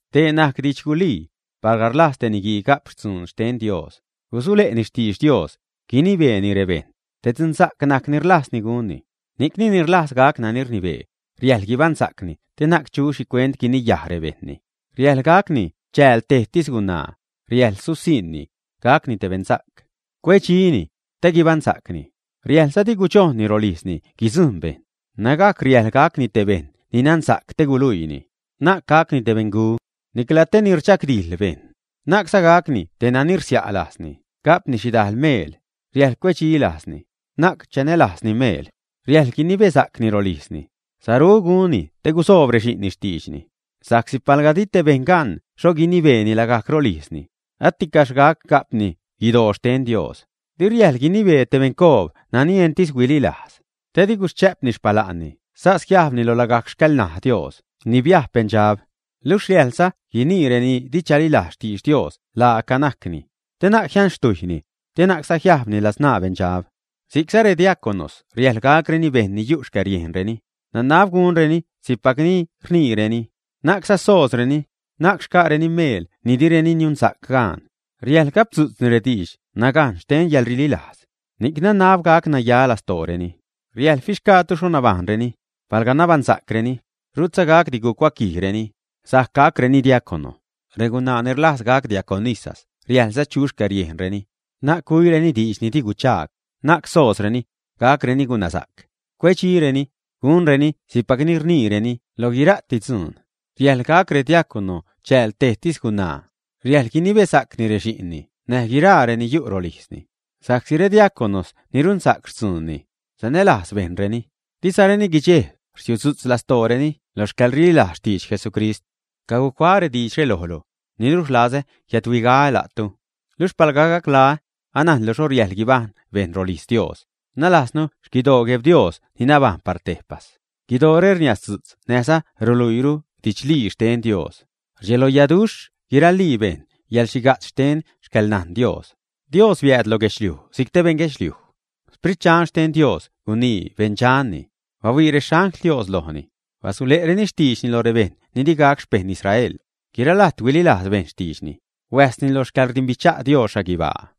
Dee najc didx gulii: palga rlajz te niguii ga'p dzuun xten Dios, gusule'ni xtidx Dios, guinibeeni rebejṉ, te dzunsa'c najc ni rlajzni gunni. Ni'cni, ni rlajz gac nani rnibee, riäjḻ guibaṉsa'cni te na'c chu xhicuent guiniyaj rebejṉni. Riäjḻ gacni chääl tejtis gunaa, riäjḻ susiṉni, gacni te beṉsa'c, cuedxini, te guibaṉsa'cni. Riäjḻza di gudxojnni rolijzni guidzujṉ bejṉ, nägajc riäjḻ gacni te bejṉ ni nansa'c te guluiini. Na'c gacni te beṉgu, nicla te ni rdxagdijḻ bejṉ, na'cza gacni te nani rsia' lajzni ga'pni xhidajl meel, riäjḻ cuedxi lajzni, na'c chanälajzni meel. Riäjḻ guinibesa'cni rolijzni, saru gunni te gusoob rexi'nni xtiidxni. Sa'csi palga di te bejṉ gan xho guinibeeni lagajc rolijzni, aticaxh gac ga'pni guidoo xten Dios. Di riäjḻ guinibee te beṉcoob nani entis huililajz, te di guschä'pni xpala'nni sas jiajbni lo lagajc xcäḻṉaj Dios ni biajb beṉdxab. Luxh riäjḻza guinii reni di chalilajz xtidx Dios laaca najcni, te na'c jianxtujyni, te na'cza jiajbni ladzṉaa beṉdxab. Si'cza rediaconos riäjḻ gacreni bejṉ ni yu' xcäriejnreni, nanab gunreni si'cpac ni rniireni, na'cza soozreni, na'c xca'reni meel ni direni niunsa'c gaan. Riäjḻ gapdzu'tzni rediidx nagajn xten yäḻrililajz, ni'c nanab gac naya lastooreni. Riäjḻ fixgaatu xho nabajṉreni. Palga nabaṉsa'creni, rutza gacdi gucuaquijdireni, sajc gacreni diacono. Regunaa ni rlajz gac diaconas riäjḻza chu xcäriejnreni, na'c güireni diidx ni di guchaag, na'c soozreni, gacreni gunasa'c, cuedxireni, gunreni si'cpac ni rniireni lo guira'ti dzuun. Riäjḻ gac rediacono chääl tejtis gunaa. Riäjḻ guinibesa'cni rexi'nni näj guiraa reni yu' rolijzni. Sa'csi rediaconos ni runsa'c xtzuunni, sanälajz bejṉreni, dizareni guidxejb rsiudzu'tz lastooreni lo xcäḻrililajz xtidx Jesucrist. Cacuaä diidxre lojlu, niluxh rlazä jiädhuigaä la'tu. Luxh palga gaclaä, anajnlu xho riäjḻ guibajṉ bejṉ rolijz Dios, nalajznu xquidoo Gueb Dios ni nabajṉ par tejpas. Guidoore rniasdzu'tz näjza ruluiiru didxlii xten Dios. Rdxeloyaduxh guiralii bejṉ yäḻxhiga'tz xten xcäḻnajn Dios: Dios biääd lo guedxliuj si'c te beṉguedxliuj, Sprit Dxan xten Dios gunii beṉdxanni; bahuii rexangl Dios lojni; basule'reni xtiidxni lo rebejṉ ni di gac xpejṉ Israel; guira lajt huililajz bejṉ xtiidxni; huäjsni lo xcäḻrdimbicha' Dios xhaguibaa.